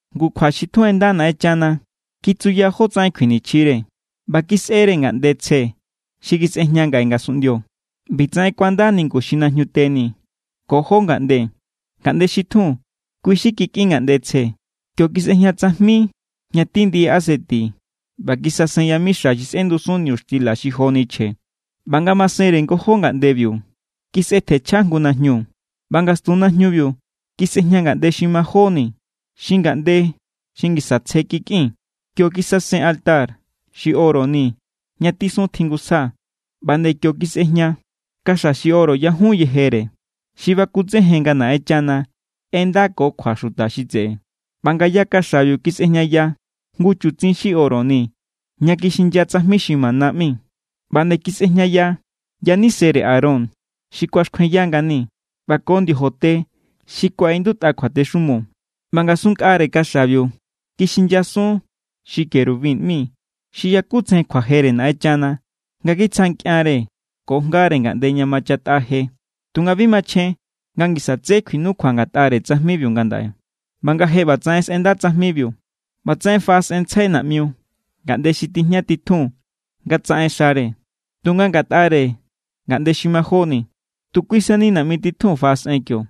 Ngu kjua xi tjun ꞌenda Naꞌenchana kitsuya jótsaꞌen kjuinichjire, ꞌba kisꞌere ngaꞌnde tsje xi kisꞌejña ngaꞌe ngasunꞌndio. ꞌBitsaꞌen kuanda ningu xi najñute ni ko jó ngaꞌnde. Ngaꞌnde xi tjun, kui xi kikꞌin ngaꞌnde tsje. Kio kisꞌejña tsajmi ña tí ndiꞌi aseti ꞌba kisasen yamixa xi sꞌendusun niñuxtila xi joni chje. ꞌBa ngamasenre ngojó ngaꞌndebiu, kisꞌetjenchja jngu najñu. ꞌBa ngastun najñubiu kisꞌejña ngaꞌnde xi majóni xi ngaꞌnde xi ngisa tsje kikꞌin. Kio kisasen altar xi oro ni ña tisun tjingusja. ꞌBa nde kio kisꞌejña kaxa xi oro yajun yejere, xi bakutsejen nga Naꞌenchana ꞌendako kjua xuta xi tseꞌe. ꞌBa ngaya kaxabiu kisꞌejñaya jngu chutsin xi oro ni ña kixinya tsajmi xi mana ꞌmi. ꞌBa nde kisꞌejñaya yanisere Aarón xi kuaxkjuenya ngani, ꞌba ko ndiojote xi kuaꞌindutꞌa kjuatexumo. ꞌBa ngasun nkꞌare kaxabiu kixinyasun xi querubin ꞌmi xi yakutsejen kjuajere Naꞌenchana nga kitsja nkꞌianre ko jngare ngaꞌnde ña machatꞌa je. Tunga bi machjen nga ngisa tsé kjuinukjua ngatꞌare tsajmibiu ngandaꞌe. ꞌBa nga je ꞌbatsaꞌen sꞌenda tsajmibiu, ꞌbatsaꞌen faꞌasꞌenntsjai naꞌmiu ngaꞌnde xi tijña titjun nga tsaꞌen xare. Tunga ngatꞌare ngaꞌnde xi majóni, tu kui sani naꞌmi titjun faꞌasꞌen kio,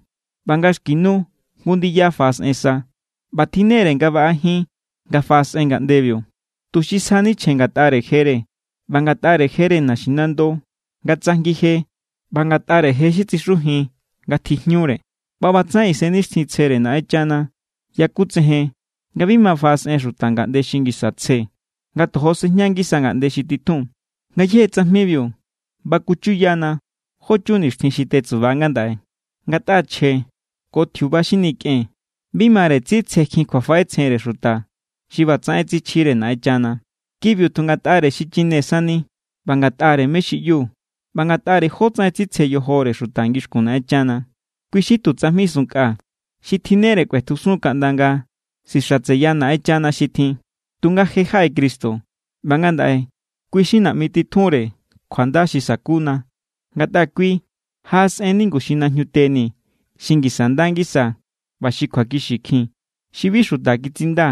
ꞌba nga xki nu jngu ndiya faꞌasꞌen sa. ꞌBa tjinnere baꞌa jin nga faꞌasꞌen ngaꞌndebiu, tuxi sjani chje ngatꞌare jere ꞌba ngatꞌare jere naxinando nga tsajngije ꞌba ngatꞌare je xi tsixujin nga tjijñure. ꞌBa ꞌbatsaꞌen Isennixtjintsjere Naꞌenchana yakutsejen nga bi ma faꞌasꞌen xuta ngaꞌnde xi ngisa tsje, nga tojo sejña ngisa ngaꞌnde xi titjun. Ngayéje tsajmibiu baku chuyana jó chun nixtjin xi tetsuba ngandaꞌe. Ngatꞌa chje ko tjiuba xi nikꞌen bi mare tsitsjekjin kjuafaꞌetsjenre xuta xi ꞌbatsaꞌen tsichjire Naꞌenchana. Kibiu tu ngatꞌare xichine sani ꞌba ngatꞌare mé= xi ꞌyu ꞌba ngatꞌare jótsaꞌen tsitsje yojore xuta ngixkun Naꞌenchana. Kui xi tu tsajmi sunnkꞌa xi tjinnere kꞌuetjusun kaꞌnda nga sixatseya Naꞌenchana xi tjin. Tunga je= jaꞌe Cristo ꞌba ngandaꞌe kui= xi naꞌmi titjunre kjuanda xi sakuna ngatꞌa kui jaꞌasꞌen ningu xi najñute ni xi ngisa nda ngisa ꞌba xi kjuakixikjin, xi bi xuta kitsinda,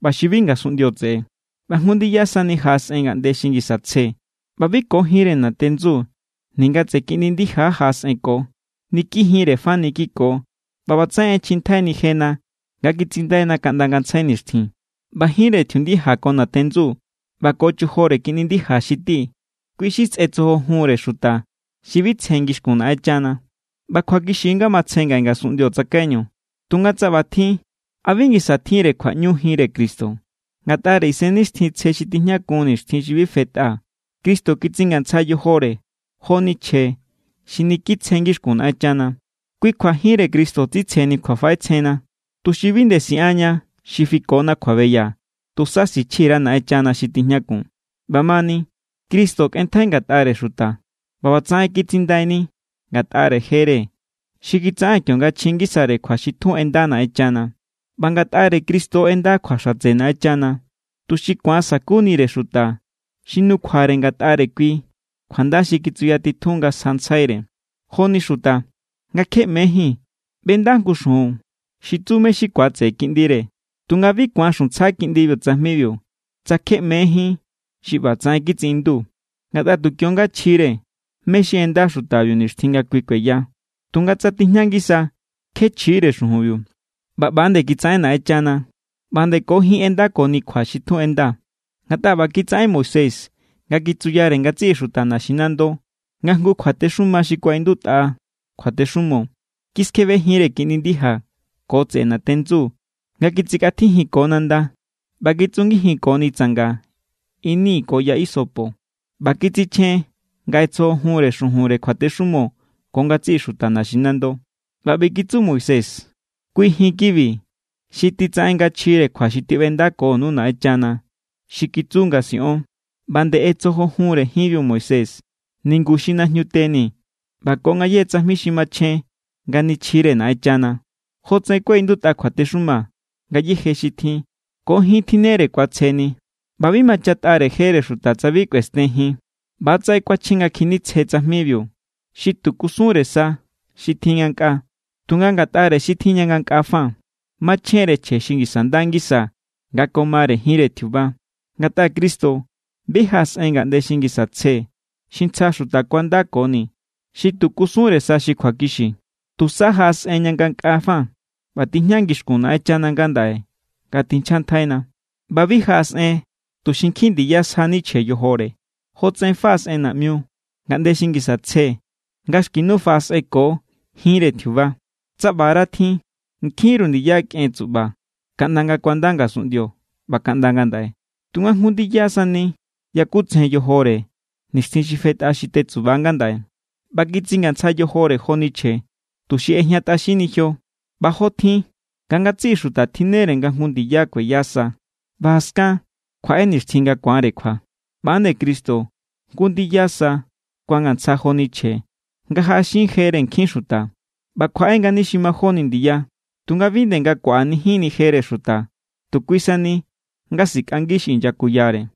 ꞌba xi bi ngasunꞌndio tseꞌe. ꞌBa jngu ndiya sani jaꞌasꞌen ngaꞌnde xi ngisa tsje, ꞌba bi ko jinre natendsu ninga tseꞌe kiꞌndi ndija jaꞌasꞌenko. Niki jinre fani kiko ꞌba ꞌbatsaꞌen ꞌechjintjaini jena nga kitsindaina kaꞌnda ngantsjai nixtjin. ꞌBa jinre tjiundija ko natendsu ꞌba ko chojore kiꞌndi ndija xi ti, kui xi sꞌetsojojunre xuta xi bi tsje ngixkun Naꞌenchana. ꞌBa kjuakixi= nga matsje ngaꞌe ngasunꞌndio tsakaiñu. Tunga tsa ꞌbatjin, ¿a bi ngisa tjinre kjuaꞌñu jinre Cristo? Ngatꞌare Isennixtjintsje xi tijñakun nixtjin xi bi fetꞌa Cristo kitsingantsja yojore joni chje xi niki tsje ngixkun Naꞌenchana. Kui kjua jinre Cristo tsitsjeni kjuafaꞌetsjenna, tuxi bi nde siꞌanña xi fikona kjuabeya, tusa sichji_ra Naꞌenchana xi tijñakun. ꞌBamani, Cristo kꞌenntjai ngatꞌare xuta ꞌba ꞌbatsaꞌen kitsindaini ngatꞌare jere xi kitsaꞌen kionga chji ngisare kjua xi tjun ꞌenda Naꞌenchana. ꞌBa ngatꞌare Cristo ꞌenda kjua xatse Naꞌenchana, tuxi ku̱an sa̱kunire xuta xi nukjuare ngatꞌare kui kjuanda xi kitsuyatitjun nga sjantsjaire. Joni xuta, nga kje ꞌmejín, ꞌbenda jngu xujun xi tsu mé= xi ku̱atseꞌe kiꞌndire. Tunga bi ku̱an xuntsja kiꞌndibiu tsajmibiu, tsa kje ꞌmejín xi ꞌba ꞌbatsaꞌen kitsiꞌindu. Ngatꞌa tu kio=nga chjire mé= xi ꞌenda xutabiu nixtjin nga kui kueya. Tunga tsa tijña ngisa, kjeé chjiíre xujunbiu. ꞌBa ꞌba nde kitsaꞌen Naꞌenchana. ꞌBa nde ko jin ꞌendakoni kjua xi tjun ꞌenda. Ngatꞌa ꞌba kitsaꞌen Moisés nga kitsuyare ngatsiꞌi xuta naxinando nga jngu kjuatexuma xi kuaꞌindutꞌa kjuatexumo. Kiskjebe jinre kiꞌndi ndija ko tseꞌe natendsu nga kitsikꞌatjijinko nanda, ꞌba kitsungijinkoni tsanga ini ko ya isopo. ꞌBa kitsichjen nga ꞌetsojojunre xujun kjuatexumo ko ngatsiꞌi xuta naxinando. ꞌBa ꞌbi kitsu Moisés: “Kui jin kibi xi titsaꞌen nga chjire kjua xi tiꞌbendakonu Naꞌenchana, xi kitsu nga siꞌon.” ꞌBa nde ꞌetsojojunre jinbiu Moisés ningu xi najñute ni ꞌba ko ngayéje tsajmi xi machjen nga nichjire Naꞌenchana. Jotsaꞌen kuaꞌindutꞌa kjuatexuma, ngayéje xi tjin, ko jin tjinnere ku̱atsjeni. ꞌBa bi machatꞌare jere xuta tsa bi kꞌuesten jin. ꞌBatsaꞌen kuachjen nga kjinitsje tsajmibiu, xi tu kusunre sa xi tjin ngankꞌaa. Tunga ngatꞌare xi tjin ña ngankꞌaa fa, machjen=re chje xi ngisa nda ngisa nga ko mare jinre tjiuba. Ngatꞌa Cristo bi jaꞌasꞌen ngaꞌnde xi ngisa tsje xi ntsja xuta kuandakoni, xi tu kusunre sa xi kjuakixiu. Tusa jaꞌasꞌen ña ngankꞌaa fa ꞌba tijña ngixkun Naꞌenchana ngandaꞌe nga tinchjantjaina. ꞌBa bi jaꞌasꞌen tuxi nkjin ndiya sjani chje yojore, jotsaꞌen faꞌasꞌen naꞌmiu ngaꞌnde xi ngisa tsje nga xki nu faꞌasꞌenko jinre tjiuba. Tsa ꞌbara tjin, nkjinru ndiya kꞌen tsuꞌba kaꞌnda nga kuanda ngasunꞌndio ꞌba kaꞌnda ngandaꞌe. Tunga jngu ndiya sani yakutsejen yojore nixtjin xi fetꞌa xi tetsuba ngandaꞌe, ꞌba kitsingantsja yojore joni chje, tuxi ꞌejñatꞌaxinni jio. ꞌBa jotjin nga ngatsiꞌi xuta tjinnere nga jngu ndiya kueya sa, ꞌba jaskan kjuaꞌe nixtjin nga ku̱anre kjua, ꞌba=nde Cristo jngu ndiya sa kuangantsja joni chje nga jaꞌaxin jere nkjin xuta. ꞌBa kjuaꞌe=ngani xi majóni ndiya, tunga bi nde nga kuaꞌanijinni jere xuta, tu kui sani nga sikꞌangi xi inyakuyare.